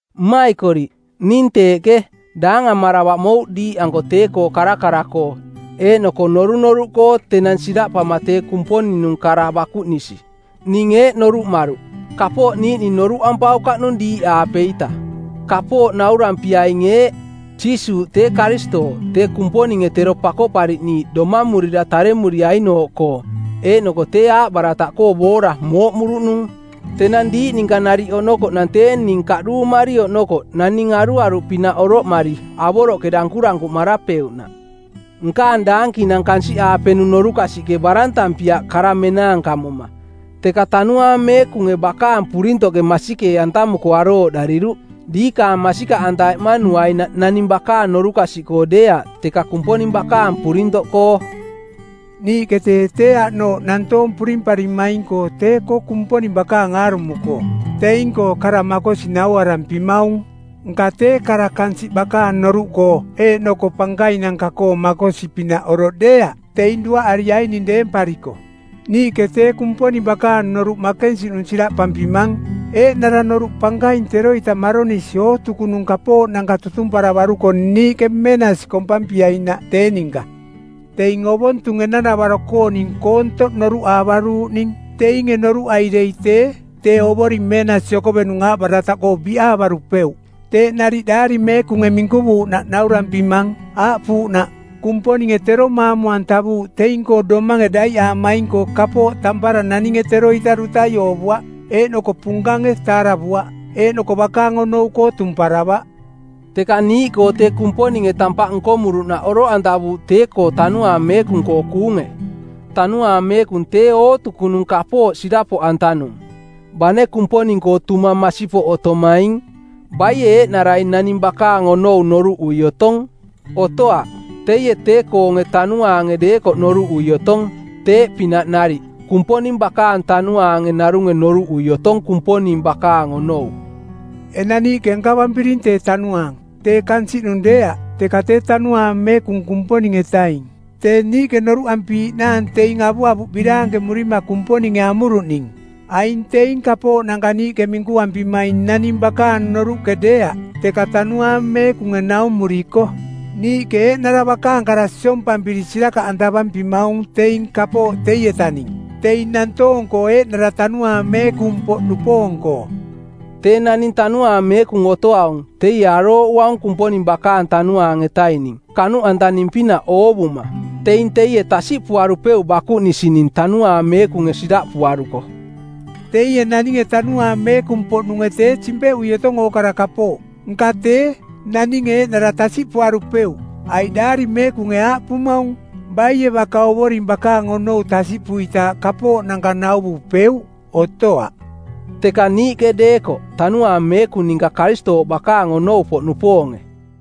Mmaikoriꞌ, ning teeꞌke, daangamaravaꞌ mouꞌ diiꞌanko tee-koo karakara-koo eeꞌnoko norunoruꞌkoo tenang siraꞌpama tee Kumponing-nung kara bakuꞌnisi. Ning eeꞌ noruꞌmaruꞌ: Kapooꞌ niiꞌning noruꞌampaukaꞌnung diiꞌaapeita. Kapooꞌ naurampiaing eeꞌ: Jiisuuꞌ tee Karistooꞌ, tee Kumponinge tero Pakoꞌpariꞌniiꞌ domamurira taremuriainooꞌkoo, eeꞌnoko tee aaꞌbarataꞌkoo boora mooꞌmuruꞌnung. Tenang diiꞌ ninka nariꞌ oꞌnokoꞌnang tee ning kaꞌduumari oꞌnokoꞌ naning aruaruꞌpinaꞌ oroꞌmari avoroꞌke dankurankuꞌmarapeuꞌnaꞌ. Nkaang daankinang kansiꞌaapenung norukasiꞌke barantampiaꞌ kara menaankamoma, teka Tanuaang Meekunge bakaang purintoꞌke masikee-antamuko arooꞌdariruꞌ, diikaang masikaꞌanta eꞌmanuainaꞌ naning bakaang norukasiꞌkoo deeaꞌ, teka Kumponing bakaang purintoꞌkoo. Niiꞌke tee tee aꞌnooꞌ nantoong purimparimaing-koo tee-koo Kumponing bakaang aarumo-koo teing-koo kara makosi nauarampimaung, nka tee kara kansiꞌ bakaang noruꞌkoo eeꞌnoko pankainanka-koo makosi-pinaꞌ oroꞌ deeaꞌ, teing duaꞌariaining deempariko. Niiꞌke tee Kumponing bakaang noruꞌ makensiꞌnung siraꞌpampimang eeꞌnara noruꞌ pankaing teroita maronisi ootukunung kapooꞌnanka tutumparavaruko niiꞌke meenasi kompampiainaꞌ tee ninka. Teing ovontung enang-navaro-kooning koontoꞌ noruꞌaavaruuꞌning. Teinge noruꞌai dei tee, Tee Ovoring Meenasi Okovenung aaꞌbarataꞌkoo biꞌaavarupeuꞌ. Teeꞌ nariꞌ Daari Meekunge minkuvuuꞌnaꞌ naurampimang, aaꞌpuuꞌnaꞌ, “Kumponinge tero maamu-antavuuꞌ teing-koo domange daiꞌaamaing-koo kapooꞌ tampara naninge teroita dutai oovuaꞌ, eeꞌnoko punkange taaravuaꞌ, eeꞌnoko bakaang onou-koo tumparavaꞌ.” Teka niiꞌkoo tee Kumponinge tampaꞌ nkomuruꞌnaꞌ oroꞌantavuuꞌ tee-koo Tanuaang Meekung-koo kuunge. Tanuaang Meekung tee ootukunung kapooꞌ sirapoꞌantanung, bane Kumponing-koo tumang masipoꞌ otomaing. Baie eeꞌnarai naning bakaang onou noruꞌui otong? Otoaꞌ. Teie tee-koonge tanuaange deekoꞌ noruꞌui otong. Teeꞌpinaꞌ nariꞌ Kumponing bakaang tanuaange narunge noruꞌui otong Kumponing bakaang onou. Enang niiꞌke nkavampiring tee Tanuaang, tee kansiꞌnung deeaꞌ, teka tee Tanuaang Meekung Kumponing-etaing tee niiꞌke noruꞌampiiꞌnaang teing avuavuꞌ biraankemurima Kumponinge amuruꞌning. Aing teing kapooꞌnanka niiꞌke minkuampimaing naning bakaang noruꞌke deeaꞌ, teka Tanuaang Meekunge naumuriko. Niiꞌke eeꞌnara bakaang kara siompampiri sirakaꞌantavampimaung teing kapooꞌ teietaning teing nantoong-koo eeꞌnara Tanuaang Meekung-poꞌnupoong-koo. Tee naning Tanuaang Meekung otoaung, teie arooꞌuaung Kumponing bakaang Tanuaang-etaning kanuꞌantaning-pinaꞌ oovuma. Teing teie tasiꞌpuarupeuꞌ bakuꞌnisining Tanuaang Meekunge siraꞌpuaruko. Teie naninge Tanuaang Meekung-poꞌnunge tee simpeꞌui otong ookara kapooꞌ, nka tee, naninge eeꞌnara tasiꞌpuarupeuꞌ. Aiꞌ Daari Meekunge aaꞌpumaung, “Baie baka Ovoring bakaang onou tasiꞌpuitaaꞌ kapooꞌnanka nauvupeuꞌ? Otoaꞌ.” Teka niiꞌke deekoꞌ, Tanuaang Meekung ninka Karistooꞌ bakaang onou-poꞌnupoonge.